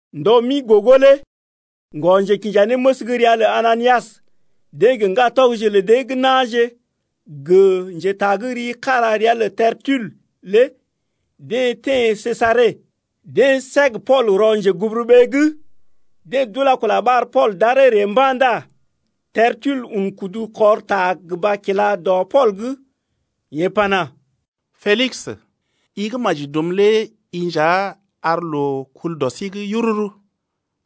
Ndɔ mi gogo lé ŋgɔ-njekinjanéməs gə́ ria lə Ananias, deḛ gə ŋgatɔgje lə dee gə́ na̰je gə njetagərii kára ria lə Tertul lé deḛ teḛ Sesare. Deḛ səg Pool rɔ njeguburuɓee’g. Deḛ d’ula-kula ɓar Pool d’aree ree mba̰ ndá Tertul un kudu kɔr ta gə mba kila dɔ Pool’g, yeḛ pana: Pelis, i gə́ maji dum lé i nja ar loo kul dɔ sí’g yururu,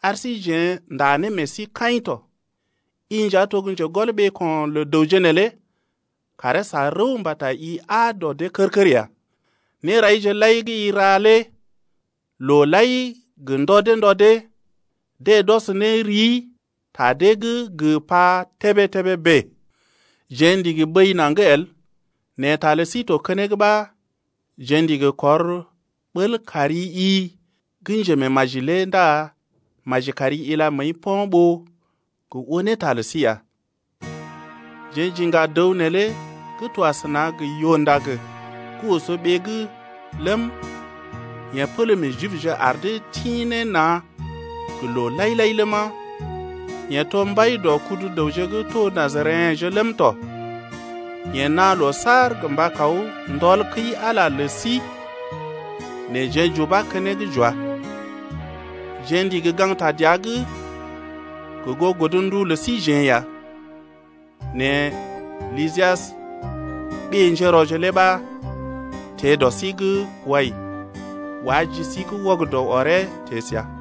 ar sí jeḛ ndá ne meḛ sí kaḭ tɔ. I nja to gə́ njegɔl ɓeeko̰ lə dəwje neelé karee sa rəw mbata i aa dɔ dee kər-kər ya. Néraije lai gə́ i ra lé loo lai gə ndɔ dee ndɔ dee, deḛ d’ɔs ne rii ta dee’g gə pa tébé-tébé bèe. Jeḛ ndigi bəi naŋg el, nɛ ta lə sí to keneŋ ɓa jeḛ ndigi kɔr bəl kari-i gə́ njemeemaji lé ndá maji kari ila məəi po̰ ɓó gə oo ne ta lə sí ya. Jeḛ j’iŋga dəw neelé gə́ to asəna gə yoo-ndag gə́ oso ɓee’g ləm, yeḛ pələ meḛ Jibje ar dee tḭ ne na̰ gə loo lai-lai ləma, yeḛ to mbai dɔ kudu dəwje gə́ to Najareḛje Najareḛje lé wɔji dɔ dəwje gə́ d’ḭ Najaret ləm tɔ. Yeḛ naa loo saar gə mba kaw kula sul dɔ kəi-Ala’g lə sí, nɛ jeḛ j’ubá keneŋ j’wá. Jeḛ ndigi gaŋgta dəa’g gə goo godndu lə síjeḛ ya, nɛ Lysias, ɓé-njérɔje lé ɓa teḛ dɔ sí’g wai, wá ji sí’g wɔgədɔ ɔree teḛ səa,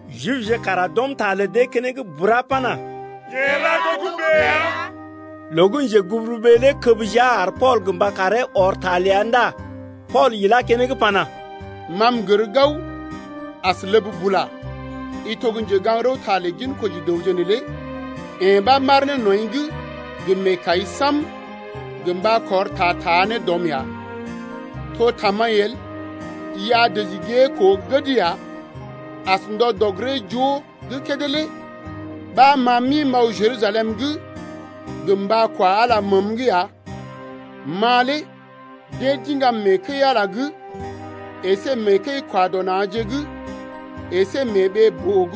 Jibje kara d’ɔm ta lə dee keneŋ bura pana: Yeḛ ra togə́bè ya. Loo gə́ njeguburuɓee lé kəb jia ar Pool gə mba karee ɔr ta ləa ndá Pool ilá keneŋ pana: Ma m’gər gao, as ləb bula i to gə́ njegaŋ-rəwta lə ginkoji dəwje neelé, yee ɓa m’aar ne nɔḭ’g gə meekai sam-sam gə mba kɔr ta taa ne dɔ rɔm ya. To tamaḭ el, i a dəji gée koo gəd ya, as ndɔ dɔg-giree-joo gə́ kédé lé ɓa ma m’ḭ m’aw Jerusalem’g gə mba kwa Ala məəm’g ya. Ma lé deḛ d’iŋgam mee kəi-Ala’g əsé mee kəi-kwa-dɔ-na̰je’g əsé gə mee ɓee-boo’g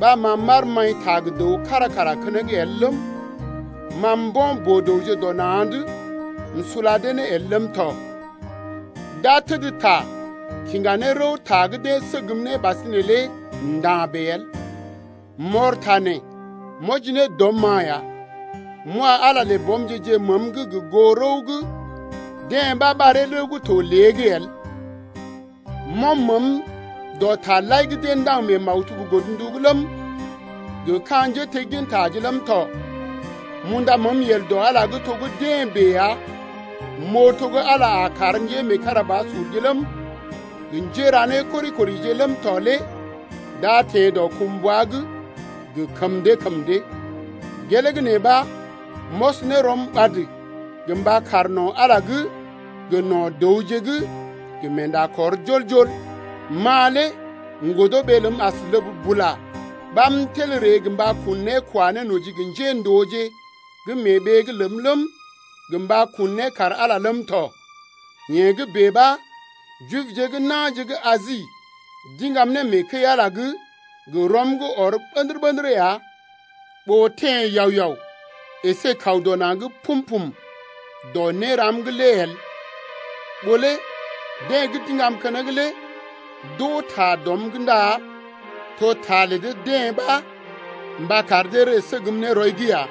ɓa ma m’aar maḭta gə dəw kára kara keneŋ el ləm, ma mbo̰ boo-dəwje dɔ na̰’d m’sula dee ne el ləm tɔ. D’a təd ta kiŋga ne rəw ta gə́ deḛ səgm ne ɓasinè lé nda̰ bèe el. M’ɔr ta nee m’wɔji ne dɔm-ma ya, m’wa Ala lə bɔmje-je məəm’g gə goo rəw gə́ deḛ ɓa ɓaree rəw gə́ to lée’g el. M’ɔm məəm dɔ taje lai gə́ deḛ ndaŋg mee maktub godndu’g ləm, gə ka̰ njéteggintaje ləm tɔ. M’unda məəm yel dɔ Ala’g lé to gə́ deḛ bèe ya m’oo to gə́ Ala lé a kar njémeekarabasurje ləm, gə njéra nékori-korije ləm tɔ lé d’a teḛ dɔkumbwa’g gə kəm dee kəm dee. Gelee gə́ nee ɓa m’ɔs ne rɔm ɓad gə mba kaar no̰ Ala’g gə no̰ dəwje’g gə meenda kɔr jol-jol. Ma lé m’godo ɓee ləm as ləb bula ɓa m’tel m’ree gə mba kun né kwa ne noji gə njéndooje gə́ mee ɓee’g ləm ləm, gə mba kun né kar Ala ləm tɔ. Yee gə́ bèe ɓa Jibje gə́ na̰je gə́ Asi d’iŋgam ne mee kəi-Ala’g gə rɔm gə́ ɔr ɓə̰dərə-ɓə̰dərə ya, ɓó teḛ yao-yao əsé kaw dɔ na̰’d pum-pum lé to gə́ néram’g lé el. Ɓó lé deḛ gə́ d’iŋgam keneŋ lé d’oo ta dɔm’g ndá to ta lə dee-deḛ ɓa mba kar dee ree səgm ne rɔi’g ya.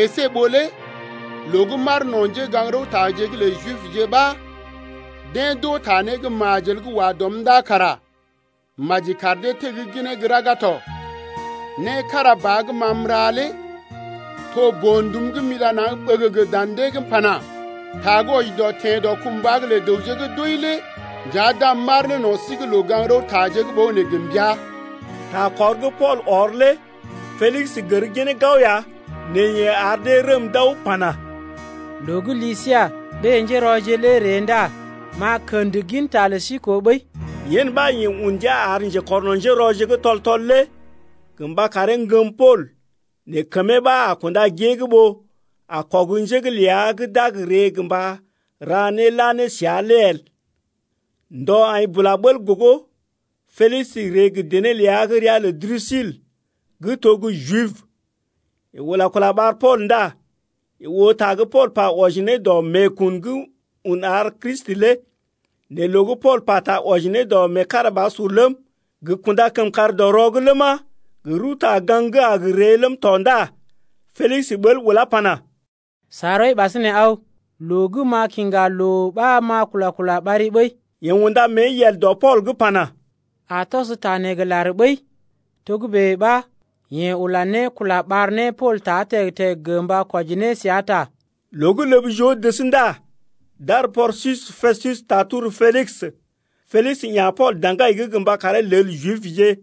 Esé ɓó lé loo gə́ m’aar no̰ njégaŋ-rəwtaje’g lə Jibje ɓa deḛ d’oo ta né gə́ majel gə́ wa dɔm’g ndá kara maji kar dee tegginee gə́ raga tɔ. Né kára ba gə́ ma m’ra lé to boo-ndum gə́ m’ila naŋg ɓəgəgə dan dee’g m’pana: Ta gə́ wɔji dɔ teḛ dɔkumbwa’g lə dəwje gə́ d’wəi lé nja d’am m’aar ne no̰ sí’g loo-gaŋg-rəwtaje’g ɓogənè gə mbəa. Takɔr gə́ Pool ɔr lé Pelis gər ginee gao ya nɛ yeḛ ar dee rəm d’aw pana: Loo gə́ Lisias, ɓé-njérɔje lé a ree ndá m’a kə̰d ginta lə sí koo ɓəi. Yen ɓa yeḛ un ndia ar njekɔrno̰ njérɔje gə́ tɔl-tɔl lé gə mba karee ŋgəm Pool nɛ kəmee ɓa a kunda gée’g ɓó a kɔg njé’g ləa gə́ d’a gə ree gə mba ra né la ne səa lé el. Ndɔ aḭ bula bəl gogo Pelis ree gə dené ləa gə́ ria lə Drusil gə́ to gə́ Jib. Yeḛ ula kula ɓar Pool ndá yeḛ oo ta gə́ Pool pa wɔji ne dɔ meekun gə́ un ar Kristi lé. Nɛ loo gə́ Pool pata wɔji ne dɔ meekarabasur ləm, gə kunda kəmkàr dɔ rɔ’g ləma, gə rəwta-gaŋg gə́ a gə ree ləm tɔ ndá Pelis ɓəl ulá pana: Sa rɔi ɓasinè aw. Loo gə́ m’a kiŋga loo ɓa m’a kula-kula ɓari ɓəi. Yeḛ unda mée yel dɔ Pool’g pana: A tɔs ta neḛ gə lar ɓəi. Togə́bè ɓa yeḛ ula ne kula ɓar ne Pool ta teg-teg gə mba kwɔji ne səa ta. Loo gə́ ləb joo dəs ndá d’ar Porsius Pestus taa tor Pelis. Pelis ya̰ Pool daŋgai’g gə mba karee lel Jibje.